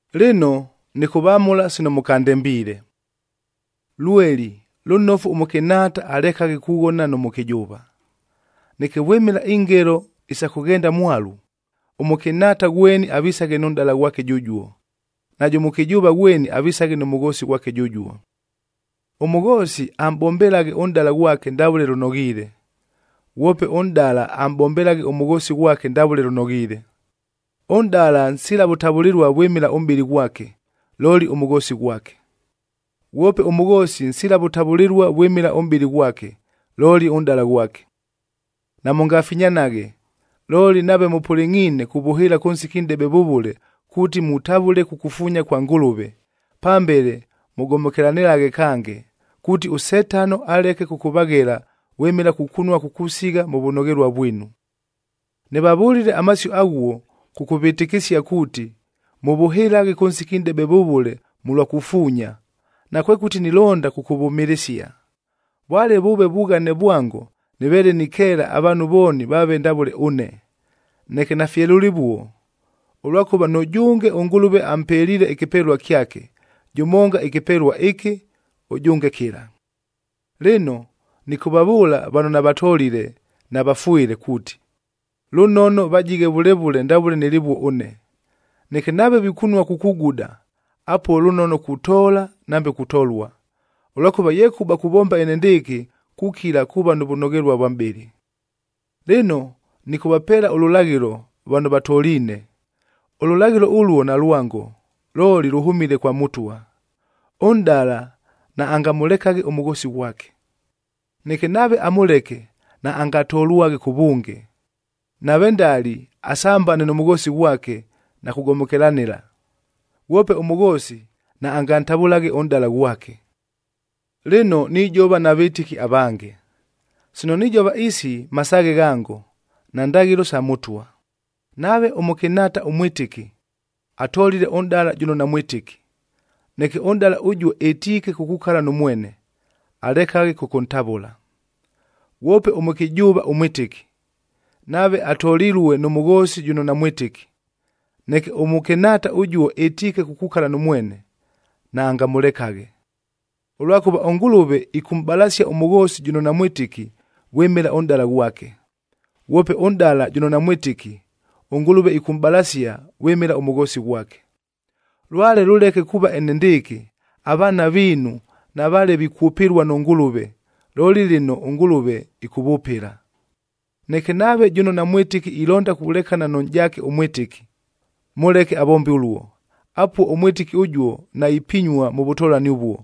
Lɨno, nɨkʉvamʉla sino mʉkandembiile. Lweli, lʉnofu ʉmʉkɨnhaata alekaghe kughona nʉ mʉkɨjʉʉva. Neke vwɨmɨla ingelo isa kʉghenda mwalu, ʉmʉkɨnhaata ghweni avisaghe nʉ nʼdala ghwake jʉjuo, najʉ mʉkɨjʉʉva ghweni avisaghe nʉ mʉghoosi ghwake jʉjuo. Ʉmʉghoosi amʼbombelaghe ʉnʼdala ghwake ndavʉle lʉnoghiile, ghwope ʉnʼdala amʼbombelaghe ʉmʉghoosi ghwake ndavʉle lʉnoghiile. Ʉnʼdala nsila vʉtavʉlɨlua vwɨmɨla ʉmʼbɨlɨ ghwake, looli ʉmʉghoosi ghwake. Ghwope ʉmʉghoosi nsila vʉtavʉlɨlua vwɨmɨla ʉmʼbɨlɨ ghwake, looli ʉnʼdala ghwake. Namʉngafinyanaghe, looli nave mʉpʉlɨngʼhiine kuvʉhɨɨla kʉ nsiki nʼdebe vʉvʉle kuuti mutavʉle kukufuunya kwa Ngʉlʉve, pambele mʉgomokelanɨlaghe kange, kuuti ʉSetano alekaghe kʉkʉvaghela vwɨmɨla kukunua kukusigha mʉ vʉnoghelua vwinu. Nɨvavʉlile amasio aghuo, kʉkʉvɨtɨkɨsia kuuti mʉvʉhɨlaghe kʉ nsiki nʼdebe vʉvʉle mʉlwa kufuunya, nakwekʉti nilonda kʉkʉvʉmɨlɨsia. Vwale vʉʉve vughane vwango nɨveele nikeela avaanhu vooni vaave ndavʉle ʉne,a neke nafye lʉlɨvuo, ʉlwakʉva nʉjʉnge ʉNgʉlʉve ampeliile ɨkɨpelua kyake, jʉmonga ɨkɨpelua ɨkɨ, ʉjʉnge kɨla. Lɨno, nɨkʉvavʉʉla vano navatolile na vafwɨle kuuti, lʉnono vajighe vʉle vʉle ndavʉle nɨlɨvuo ʉne. Neke nave vikunua kukuguda, apuo lʉnono kutoola nambe kutolua, ʉlwakʉva yekʉba kuvomba enendɨɨkɨ kukila kuuva nʉ vʉnoghelua vwa mʼbɨlɨ. Lɨno, nɨkʉvapeela ʉlʉlaghɨlo vano vatoliine. Ʉlʉlaghɨlo ʉluo nalwango, looli lʉhʉmile kwa Mʉtwa: Ʉnʼdala naangamʉlekaghe ʉmʉghoosi ghwake. Neke nave amʉleke, naangatolwaghe kʉvʉnge, nave ndali, asambane nʉ mʉghoosi ghwake na kugomokelanɨla. Ghwope ʉmʉghoosi, naangantavʉlaghe ʉnʼdala ghwake. Lɨno nijova na vɨtɨki avange. Sino nijova isi masaaghe ghango, nandaghɨlo sa Mʉtwa: Nave ʉmʉkɨnhaata ʉmwɨtɨki, atolile ʉnʼdala jʉno namwɨtɨki, neke ʉnʼdala ʉjuo ɨtiike kukukala nʉ mwene, alekaghe kʉkʉntavʉla. Ghwope ʉmʉkɨjʉʉva ʉmwɨtɨki, nave atolilue nʉ mʉghoosi jʉno namwɨtɨki, neke ʉmʉkɨnhaata ʉjuo ɨtiike kukukala nʉ mwene, naangamʉlekaghe. Ʉlwakʉva ʉNgʉlʉve ɨkʉmʼbalasia ʉmʉghoosi jʉno namwɨtɨki, vwɨmɨla ʉnʼdala ghwake. Ghwope ʉnʼdala jʉno namwɨtɨki, ʉNgʉlʉve ɨkʉmʼbalasia vwɨmɨla ʉmʉghoosi ghwake. Lwale lʉleke kuuva enendɨɨkɨ, avaana viinu navaale vikwʉpɨlua nʉ Ngʉlʉve, looli lɨno ʉNgʉlʉve ɨkʉvʉpɨla. Neke nave jʉno namwɨtɨki ilonda kulekana nʉ nʼjaake ʉmwɨtɨki, mʉleke avombe ʉluo. Apuo ʉmwɨtɨki ʉjuo naipinyua mʉ vʉtolani ʉvuo.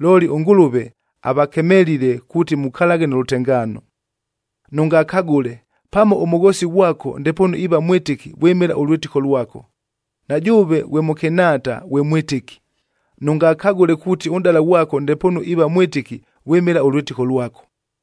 Looli ʉNgʉlʉve avakemelile kuuti mukalaghe nʉ lʉtengaano. Nʉngakagʉle! Pamo ʉmʉghoosi ghwako ndepoonu iiva mwɨtɨki vwɨmɨla ʉlwɨtɨko lwako. Na jʉʉve ghwe mʉkɨnhaata ghwe mwɨtɨki, nʉngakagʉle kuuti ʉnʼdala ghwako ndepoonu iiva mwɨtɨki vwɨmɨla ʉlwɨtɨko lwako.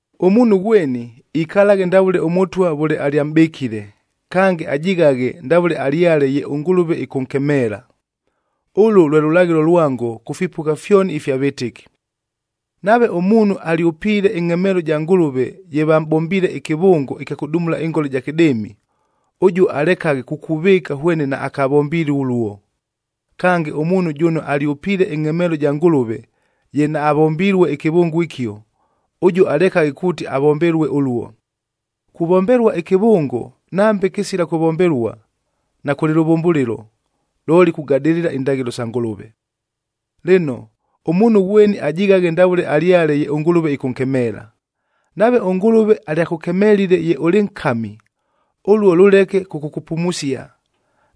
Ʉmuunhu ghweni ikalaghe ndavʉle ʉMʉtwa vʉle alyamʼbɨkile, kange ajighaghe ndavʉle alyale ye ʉNgʉlʉve ɨkʉnkemeela. Ʉlʉ lwe lʉlaghɨlo lwango kʉ fipʉgha fyoni ifya vɨtɨki. Nave ʉmuunhu alyʉpiile ɨngʼhemeelo ɨja Ngʉlʉve ye vamʼbombiile ɨkɨvʉngo ɨkya kʉdumula ɨngola ɨja kɨdɨɨmi,b ʉjuo alekaghe kukuvɨɨka hwene naakavombilue ʉluo. Kange, ʉmuunhu jʉno alyʉpiile ɨngʼhemeelo ɨja Ngʉlʉve ye naavombilue ɨkɨvʉngo ɨkio, ʉjuo alekaghe kuuti avombelue ʉluo. Kuvombelua ɨkɨvʉngo nambe kɨsila kʉvombelua, nakʉlɨ lʉvʉmbʉlɨlo, looli kugadɨlɨla indaghɨlo sa Ngʉlʉve. Lɨno, ʉmuunhu ghweni ajighaghe ndavʉle alyale ye ʉNgʉlʉve ɨkʉnkemeela. Nave ʉNgʉlʉve alyakʉkemelile ye ʉlɨ nkami, ʉluo lʉleke kʉkʉkʉpumusia.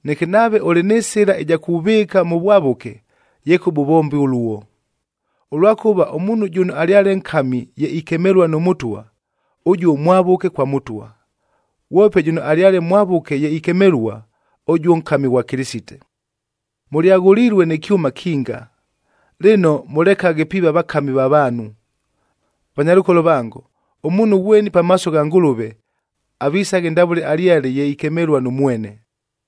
Neke nave ʉlɨ nɨ sɨla ɨja kuvɨɨka mʉ vwavʉke, yekʉba ʉvombe ʉluo. Ʉlwakʉva ʉmuunhu jʉno alyale nkami ye ikemelua nʉ Mʉtwa, ʉjuo mwavʉke kwa Mʉtwa. Ghwope jʉno alyale mwavʉke ye ikemelua, ʉjuo nkami ghwa Kɨlɨsite. Mʉlyaghʉlilue nɨ kyʉma kinga. Lɨno, mʉlekaghe piiva vakami va vaanhu. Vanyalʉkolo vango, ʉmuunhu ghweni pamaaso gha Ngʉlʉve, avisaghe ndavʉle alyale ye ikemelua nʉ mwene.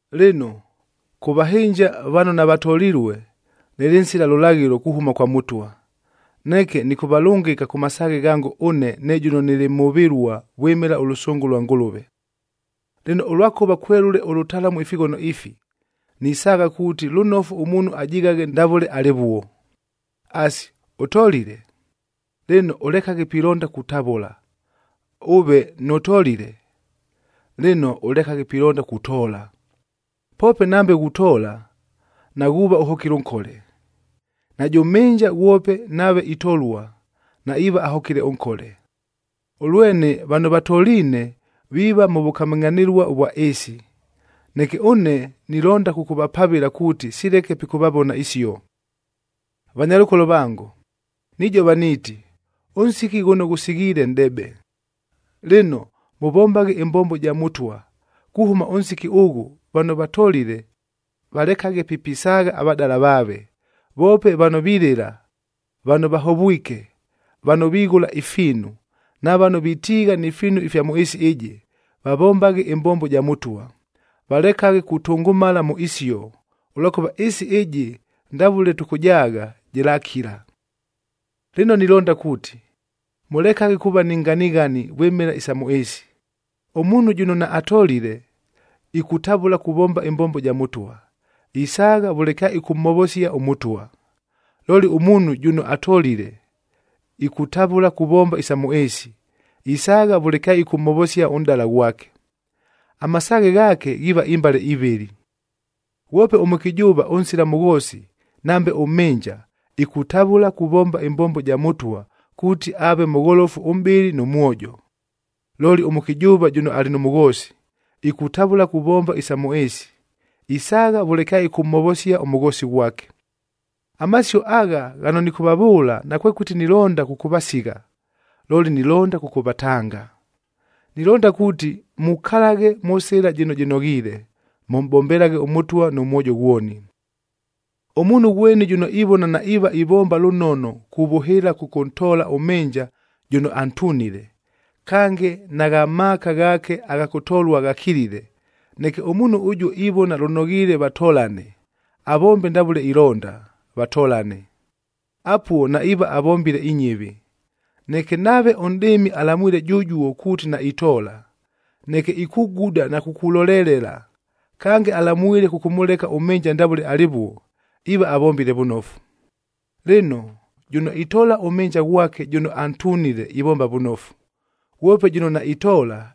Lɨno, kʉ vahɨnja vano navatolilue, nɨlɨ nsila lʉlaghɨlo kuhʉma kwa Mʉtwa. Neke nɨkʉvalʉngɨka kʉ masaaghe ghango ʉne ne jʉno nɨlɨ mhʉvɨlua vwɨmɨla ʉlʉsʉngʉ lwa Ngʉlʉve. Lɨno, ʉlwakʉva kwelʉle ʉlʉtalamu ifighono ifi, nisaagha kuuti lʉnofu ʉmuunhu ajighaghe ndavʉle alɨvuo. Asi, ʉtolile? Lɨno, ʉlekaghe pilonda kutavʉla. Ʉve nʉtolile? Lɨno, ʉlekaghe pilonda kutoola. Poope nambe ghutoola, naghuuva ʉhokile nkole. Najʉ mhɨnja ghwope nave itolua, naiiva ahokile nkole. Ʉlwene, vano vatoliine viiva mʉ vʉkamɨngʼhanɨlua ʉvwa ɨɨsi. Neke ʉne nilonda kʉkʉvapavɨla kuuti sileke pikʉvavona isio. Vanyalʉkolo vango, nijova niiti, ʉnsiki ghʉno ghʉsighiile nʼdebe. Lɨno, mʉvombaghe ɨmbombo ja Mʉtwa, kuhʉma ʉnsiki ʉghʉ vano vatolile, valekaghe pi pisaagha avadala vaave. Voope vano vilɨla, vano vahovwike, vano vighʉla ifiinu, na vano vitiigha ni fiinu ifya mʉ ɨɨsi ɨjɨ, vavombaghe ɨmbombo ja Mʉtwa, valekaghe kutʉngʉmala mʉ isio, ʉlwakʉva ɨɨsi ɨjɨ ndavʉle tʉkʉjaagha, jɨlakila. Lɨno nilonda kuuti, mʉlekaghe kuuva ni nganighani vwɨmɨla isa mʉ ɨɨsi. Ʉmuunhu jʉno naatolile, ikutavʉla kuvomba ɨmbombo ɨja Mʉtwa, isaagha vʉle kyaɨkʉmhovosia ʉMʉtwa. Looli ʉmuunhu jʉno atolile, ikutavʉla kuvomba isa mʉ ɨɨsi, isaagha vʉle kyaɨkʉmhovosia ʉnʼdala ghwake, amasaaghe ghaake ghiiva imbale ivɨlɨ. Ghwope ʉmʉkɨjʉʉva ʉnsila mʉghoosi nambe ʉmhɨnja, ikutavʉla kuvomba ɨmbombo ja Mʉtwa kuuti aave mʉgholofu ʉmʼbɨlɨ nʉ mwojo. Looli ʉmʉkɨjʉʉva jʉno alɨ nʉ mʉghoosi, ikutavʉla kuvomba isa mʉ ɨɨsi, isaagha vʉle kyaɨkʉmhovosia ʉmʉghoosi ghwake. Amasio agha ghano nɨkʉvavʉʉla nakwekʉti nilonda kʉkʉvasigha, looli nilonda kʉkʉvatanga. Nilonda kuuti mukalaghe mʉ sɨla jɨno jɨnoghiile, mʉmʼbombelaghe ʉMʉtwa nʉ mwojo ghwoni. Ʉmuunhu ghweni jʉno ivona naiiva ivomba lʉnono kuvʉhɨɨla kʉkʉntoola ʉmhɨnja jʉno antunile, kange nagha maaka ghaake agha kʉtolua ghakilile, neke ʉmuunhu ʉjuo ivona lʉnoghiile vatolane, avombe ndavʉle ilonda, vatolane. Apuo naiiva avombile inyɨvi. Neke nave ʉnʼdɨɨmi alamwile jʉjuo kuuti naitoola, neke ikuguda na kukulolelela, kange alamwile kʉkʉmʉleka ʉmhɨnja ndavʉle alɨvuo, iiva avombile vʉnofu. Lɨno, jʉno itoola ʉmhɨnja ghwake jʉno antunile ivomba vʉnofu. Ghwope jʉno naitoola,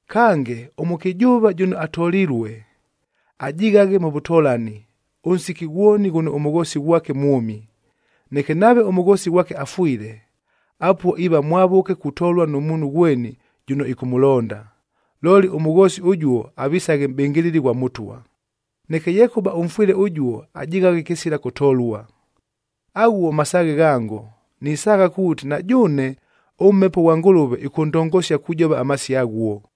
Kange, ʉmʉkɨjʉʉva jʉno atolilue, ajighaghe mʉ vʉtolani, ʉnsiki ghwoni ghʉno ʉmʉghoosi ghwake mwʉmi. Neke nave ʉmʉghoosi ghwake afwile, apuo iiva mwavʉke kutolua nʉ muunhu ghweni jʉno ɨkʉmʉlonda, looli ʉmʉghoosi ʉjuo avisaghe mʼbɨngɨlɨli ghwa Mʉtwa. Neke yekʉba ʉmfwɨle ʉjuo ajighaghe kɨsila kʉtolua. Aghuo masaaghe ghango, nisaagha kuuti na jʉʉne ʉMhepo ʉghwa Ngʉlʉve ɨkʉndongosia kujova amasio aghuo.